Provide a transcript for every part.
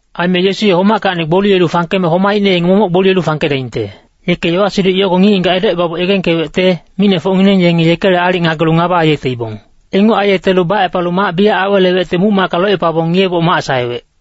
Aime Yesu ye homackacni gboliyelu fangkeme homaicne yenge momoc gboliyelu fangkedaingte. Yeke yowa-siduc yogo ngic-ngigac edocebaboc yegengkewecte, micnefocngineng yenge yekele aalic ngagelu ngaba aiyeteibong. Inguc aiyetelu bacepalu mac biyac awelewecte muc-macka locepabong ngiyeboc mac saewec.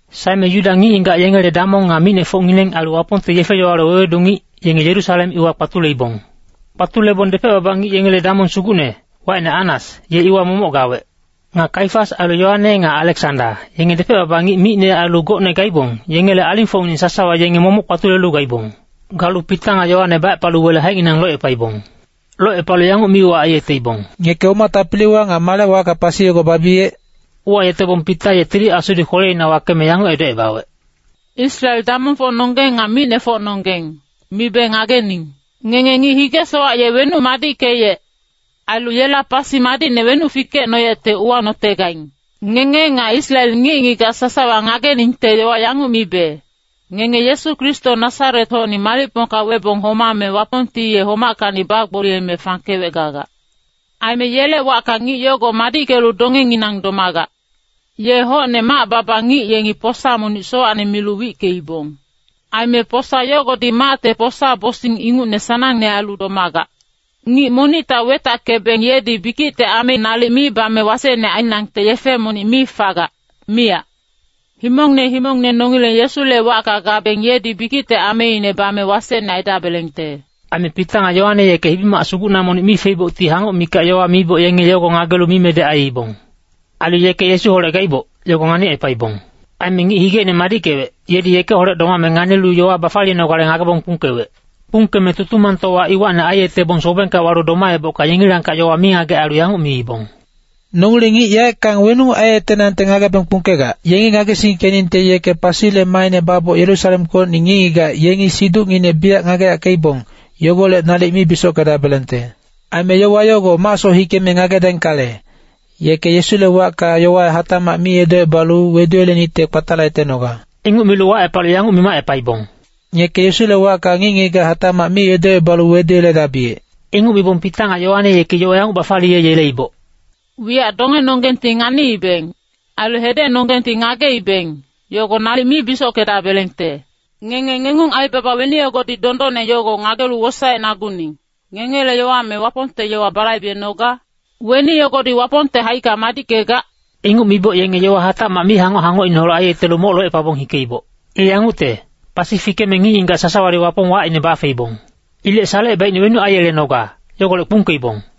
Saeme Yuda ngic-ngigac yengele damong nga micnefocngineng ailu Wapongte yefe-yowale wewedu ngic, yenge Yerusalem iwa kpatuleibong. Kpatulebong depec-baba ngic yengele damong sugucne, wacine Annas, ye iwa momoc gawec. Nga Kaifas ailu Yoane nga Aleksanda, yenge depec-baba ngic micne ailu gocne gaibong, yengele alingfocngineng sasawa yenge momoc kpatulelu gaibong. Galu Pita nga Yoane bacepalu wele haicnginang locepaibong. Locepalu yanguc mi-uwac aiyeteibong, “Ngeke oma tapiliwa nga male wacka pasi yogo babiyec?” Uwayetebong Pita ye Tili Asudi kweleina wakeme yanguc edocebawec, “Israel damongfocnonggeng nga micnefocnonggeng, mibe ngagening. Ngenge ngic hige-sowac ye wenuc madickeyec, ailu yela pasi madicne wenuc fikecnoyecte uwanotegaing. Ngenge nga Israel ngic-ngigac sasawa ngageningte yowa yanguc mibe, ngenge Yesu Kristo Nasaret-hocni malicpongka webong homame Wapongti ye homackacni bagboliyeme fangkewec gagac. Aime yele wacka ngic yogo madickelu dongenginang domagac. ‘Ye hocne mac-baba ngic yengi posa monic sowacne milu wickeibong. Aime posa yogodi macte posa-bosing ingucne sanangne ailu domagac.’ Ngic monicta wetackebeng yedi bikicte ame nalic mi bame wasecne ainangte yefe monic mi fagac, miyac. Himongne himongne nongileng Yesule wacka gabeng yedi bikicte ameine bame wasecne aidabelengte.” Aime Pita nga Yoane yeke hibi-mac sugucna monic mi feibocti hangoc mikac yowa miboc yenge yogo ngagelu mimedec aiibong. Ailu yeke Yesuholec gaiboc, yogo nganicepaibong. Aime ngic higeine madickewec, yedi yekeholec domame nganilu yowa bafaliyenogale ngagebong kpungkewec. Kpungkeme Tutumangtowa iwacni aiyetebong sobengka walu domaebocka yengilangkac yowa mingagec ailu yanguc miibong, “Nongileng ngic yaeckang weninguc aiyetenangte ngagebeng kpungkegac. Yengi ngagesingkeningte yeke pasile maaine baboc Yerusalemkocni ngic-ngigac yengi siducnginec biyac ngageyackeibong, yogolec nalic mi bisockedabelengte. Aime yowa yogo macsoc hikeme ngagedaingkale, yeke Yesule wacka yowa hatacmac mi edocebalu weduyelenicte kpatalayetenoga.” Inguc milu wacepalu yanguc mimacepaibong, “Ngeke Yesule wacka ngic-ngigac hatacmac mi edocebalu weduyeledabiyec.” Inguc mibong Pita nga Yoane yeki yowa yanguc bafaliyeyeleiboc, “Wiyac dongenonggengti nganiibeng, ailu hedecnonggengti ngageibeng, yogo nalic mi bisockedabelengte. Ngenge ngengung aibaba weni yogodi dondonne yogo ngagelu wosaecnaguning, ngengele yowa me Wapongte yowa balaibenoga? Weni yogodi Wapongte haicka madickegac?” Inguc miboc yenge yowa hatacmac mihangoc-hangocineholec aiyetelu moc locepabong hikeiboc. I yangucte, pasi fikeme ngic-ngigac sasawadi Wapong wacine bafeibong. Ilec salecebaicne wenuc aiyelenoga, yogolec kpungkeibong.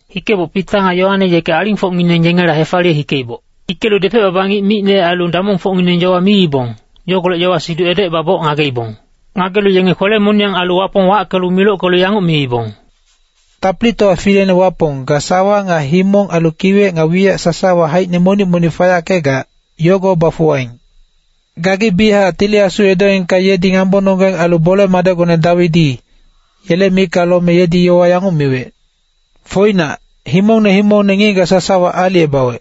Hikeboc Pita nga Yoane yeke alingfocngineng yengela hefaliye hikeiboc. Hikelu depec-baba ngic micne ailu damongfocngineng yowa miibong, yogolec yowa-siduc edocebaboc ngageibong. Ngagelu yenge kwele-moniyang ailu Wapong wackelu milockelu yanguc miibong, “Tapilitowa fileine Wapong, ga sawa nga himong ailu kiwec nga wiyac sasawa haicine monic-monic fayackegac, yogo bafuwaing. Gagi biyachac Tili Asu edoengka yedi ngambononggeng ailu bole-madecgone Dawidi, yele micka lome yedi yowa yanguc miwec. ‘Foinac, himongne himongne ngic-ngigac sasawa aalicebawec.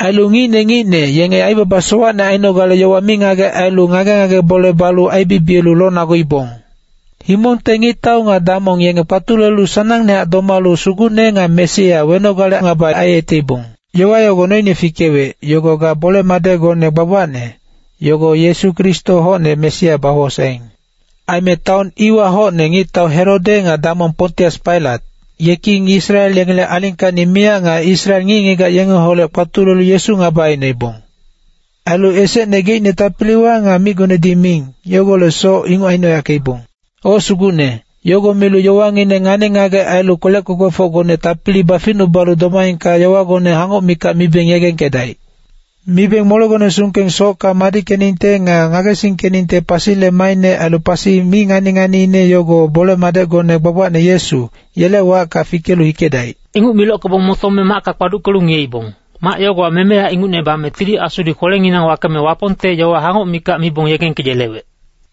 Ailu ngicne ngicne yenge aibaba sowacne ainogale yowa mingagec ailu ngage-ngage bole balu aibibiyelu lonaguibong. Himongte ngictau nga damong yenge kpatulelu sanangnehac domalu Sugucne nga Mesia wenogale ngaba aiyeteibong.’ Yowa yogo noine fikewec, yogo ga bole-madecgone gbagbacne, yogo Yesu Kristo hocne Mesia bawosaeing. Aime taon iwa hocne ngictau Herode nga damong Pontius Pailat, yeki Israel yengele alingkacni miyac nga Israel ngic-ngigac yengeholec kpatulelu Yesu ngaba aicnoibong. Ailu esecne geicne tapiliwa nga micgonedi miing, yogolecsoc inguc aicnoyackeibong. O Sugucne, yogo milu yowangineng ngani-ngagec ailu kwelec kwekwefocgone tapili baficnubalu domaengka yowagone hangoc mikac mibeng yegengkedaic. Mibeng molegone sungkeng socka madickeningte nga ngagesingkeningte pasile maaine ailu pasi mi ngani-nganiine yogo bole-madecgone gbagbacne Yesu, yele wacka fikelu hikedaic.” Inguc milockebong motome macka kpaduckelu ngiyeibong, mac yogowa memeya ingucne bame Tili Asudi kwelenginang wakeme Wapongte yowa hangoc mikac mibong yegengkeyelewec.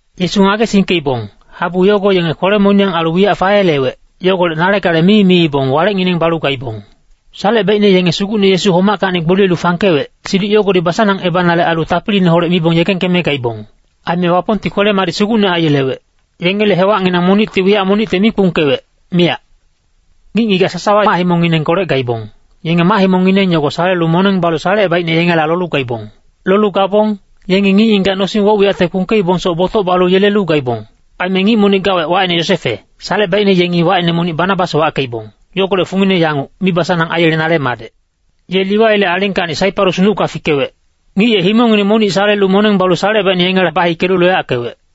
Yesu ngagesingkeibong, habu yogo yenge kwele-moniyang ailu wiyac fayelewec, yogolec nale gale mi miibong walecngineng balu gaibong. Salecebaicne yenge Sugucne Yesu homackacni gboliyelu fangkewec, siduc yogodi basanangebanale ailu tapiliineholec mibong yegengkeme gaibong. Aime Wapongti kwele-madic sugucne aiyelewec. Yengele hewacnginang monicti wiyac monicte mi kpungkewec, miyac. Ngic-ngigac sasawa mac-himongnginengkolec gaibong, yenge mac-himongngineng yogo salelu moneng balu salecebaicne yengela lolu gaibong. Lolu gabong, yengi ngic-ngigac nosing woc-wiyacte kpungkeibongsoc botoc balu yelelu gaibong. Aime ngic monic gawec wacine Yosefe, salecebaicne yengi wacine monic Banabas wackeibong, yogolec fungine yanguc, mibasanang aiyelenale madec. Ye Liwaile alingkacni Saiparus nucka fikewec. Ngic ye himongngine monic salelu moneng balu salecebaicne yengela bahikelu loyackewec.